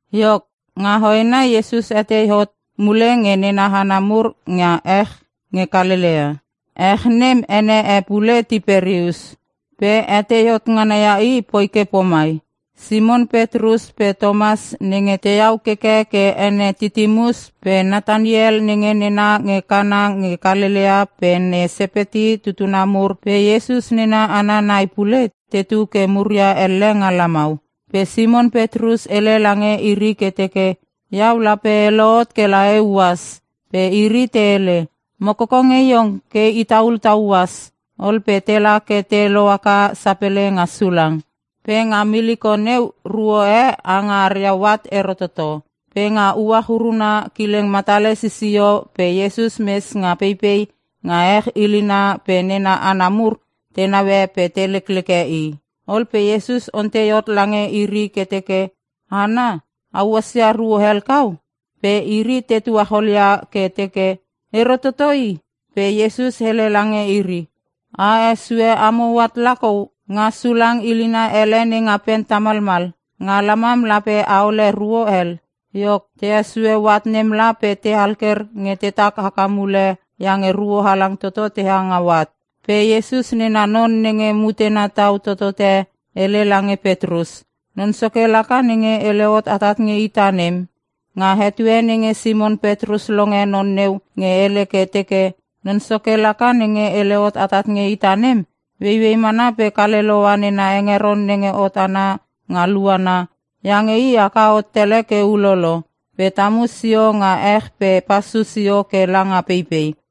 Iok, nga hoena Iesus hetei hot mule nge nena hana mur nga ech nge Kalelea. (ech nem ene e pule Tiperius) Pe hetei hot ngana ia i poi ke pomai: Simon Petrus pe Tomas (nenge tehau keke ke ene Titimus) pe Nataniel (nenge nena nge Kana nge Kalelea) pe ne Sepeti tutuna mur pe Iesus nena hana nai pule, tetu ke muria elle nga lamau. Pe Simon Petrus hele lange iri ke teke, “Iau lape e lohot kela euas.” Pe iri te hele, “Mo koko nge iong ke itaul ta uas.” Ol pe tela ke te lohaka sapele nga sulang. Pe nga miliko neu ruo e ha nga aria hoat ero toto. Pe nga uach uruna kileng matale sisio pe Iesus mes nga peipei nga ech ilina pe nena hana mur te naue pe te lekleke i. Ol pe Iesus ontei hot lange iri ke teke, “Hana, a uasia ruo hel kau?” Pe iri te tuachol ia ke teke, “Ero toto i!” Pe Iesus hele lange iri, “A hesue amo hoat lakou nga sulang ilina ele nenga pen tamalmal. Nga lamam lape aole ruo hel.” Iok, te hesue hoat nem la pe te alker nge tetak haka mule iange ruo halang toto teha nga hoat. Pe Iesus nena non nenge mutena tau totote hele lange Petrus, “Non Soke laka nenge hele hot atat nge ita nem!” Nga etue nenge Simon Petrus longe non neu nge hele ke teke “Non Soke laka nenge hele hot atat nge ita nem,” ueiuei mana kale loua nena hengeron nenge hot ana nga luana (iange i haka hot tele ke ulolo) pe tamu sio nga ech pe pasu sio ke langa peipei.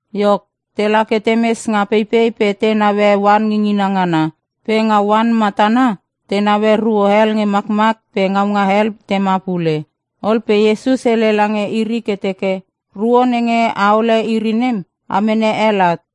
Iok, tela ke temes nga peipei pe te naue oan ngingina ngana. Pe nga oan matana te naue ruo hel nge makmak pe ngaunga hel tema pule. Ol pe Iesus hele lange iri ke teke, “Ruo nenge aole iri nem, a mene hel at.”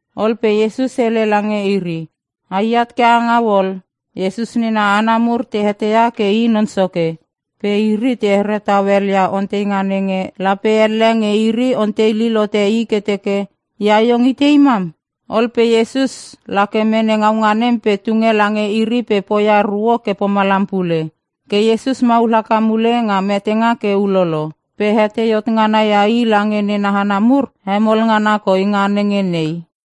Ol pe Iesus hele lange iri, “Aiat ke angau ol.” Iesus nena hana mur te eteia ke i Non Soke. Pe iri te here tau helia onteinga nenge, lape elle nge iri ontei lil hote i ke teke, “Ia iong itei mam?” Ol pe Iesus lake mene ngaunga nem pe tunge lange iri pe poia ruo ke pomalam pule. Ke Iesus maul haka mule nga metenga ke ulolo. Pe hetei hot ngana ia i lange nena hana mur hemol ngana koi nga nenge nei.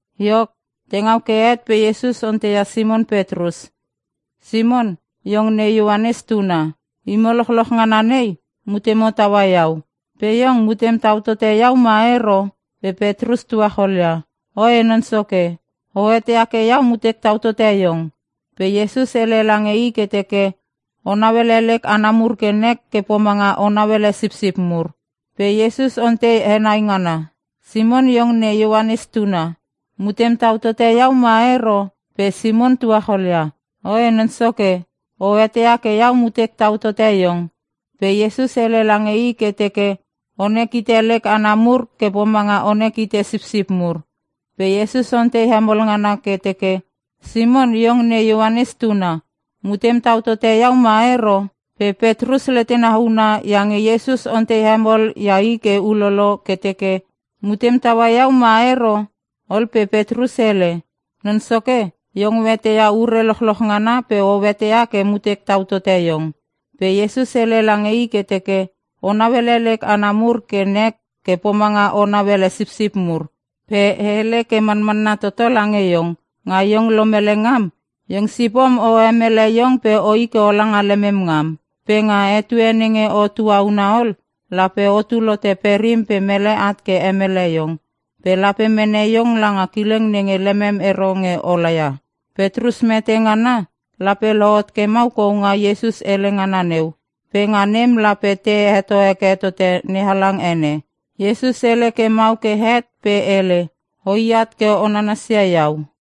Iok, te ngau ke het pe Iesus onteia Simon Petrus, “Simon, iong ne Ioanes tuna. Imo lochloch ngana nei mutemo taua iau, pe iong mutem tau tote iau ma ero?” Pe Petrus tuacholia, “Oe Non Soke. O eteia ke iau mutek tau tote Iong.” Pe Iesus hele lange i ke teke, “O nauele lek hana mur ke nek ke pomanga o nauele sipsip mur.” Pe Iesus ontei henai ngana, “Simon iong ne Ioanes tuna. Mutem tau tote iau ma ero?” Pe Simon tuacholia, “Oe Non Soke, o eteia ke iau mutek tau tote Iong.” Pe Iesus hele lange i ke teke, “Onek hite lek hana mur ke pomanga onek hite sipsip mur.” Pe Iesus ontei hemol ngana ke teke, “Simon iong ne Ioanes tuna. Mutem tau tote iau ma ero?” Pe Petrus letena huna iange Iesus ontei hemol ia i ke ulolo ke teke. “Mutem taua iau ma ero?” Ol pe Petrus hele, “Non Soke Iong o eteia ure lochloch ngana pe o eteia ke mutek tau tote iong!” Pe Iesus hele lange i ke teke, “O nauele lek hana mur ke nek ke pomanga o nauele sipsip mur. Pe e hele ke manmanna toto lange iong; Nga iong lomele ngam iong sipom o hemele iong pe oi ke ola nga lemem ngam. Pe nga etue nenge o tuauna ol lape otul hote perim pe mele at ke hemele iong. Pe lape mene iong langa kileng nenge lemem ero nge ola ia.” (Petrus mete ngana lape lohot ke mau kou nga Iesus hele ngana neu. Pe nga nem lape te heto heke tote NeHalang ene.) Iesus hele ke mau ke het pe hele, “Oi at ke o nanasia iau.”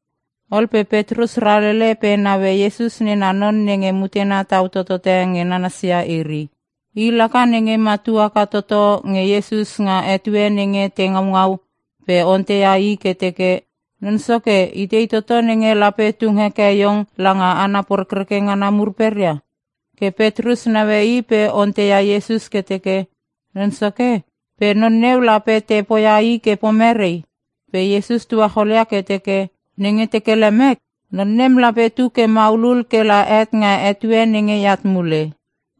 Ol pe Petrus ralele pe naue Iesus nena non nenge mutena tau totote nge nananasia iri. (I laka nenge matu haka toto nge Iesus nga etue nenge te ngaungau pe onteia i ke teke, “Non Soke itei toto nenge lape tung heke iong langa hana porekreke ngana mur peria?”) Ke Petrus naue i pe onteia Iesus ke teke, “Non Soke, pe non neu lape te poia i ke pomerei?” Pe Iesus tuacholia ke teke, “Nenge teke lemek non nem lape tu ke maulul kela het nga etue nenge eat mule.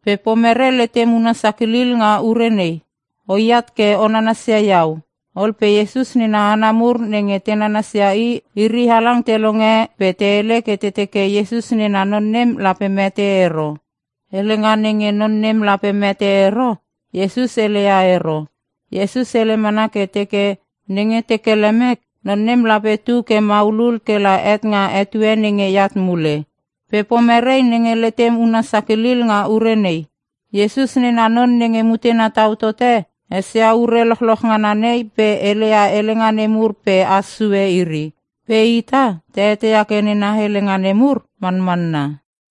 Pe pomerei nenge letem una sakilil nga ure nei? O iat ke o nanasia iau!” Ol pe Iesus nena hana mur nenge te nananas ia i, iri halang te longe pe te hele ke te teke Iesus nena non nem lape mete ero. Helenga nenge non nem lape mete ero Iesus heleia ero. Iesus hele mana ke teke, “Nenge teke lemek non nem lape tu ke maulul kela het nga etue nenge eat mule. Pe pomerei nenge letem huna sakilil nga ure nei?” Iesus nena non nenge mutena tau tote esia ure lochloch ngana nei pe heleia helenga nemur pe has sue iri. Pe ita ta eteia ke nena helenga nemur manmanna.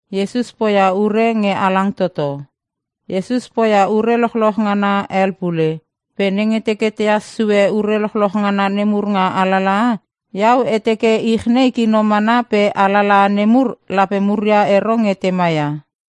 Iesus poia ure lochloch ngana hel pule. Pe nenge teke tehas sue ure lochloch ngana nemur nga alalaha, iau e teke ich nei kino mana pe alalaha nemur lape muria ero nge tema ia.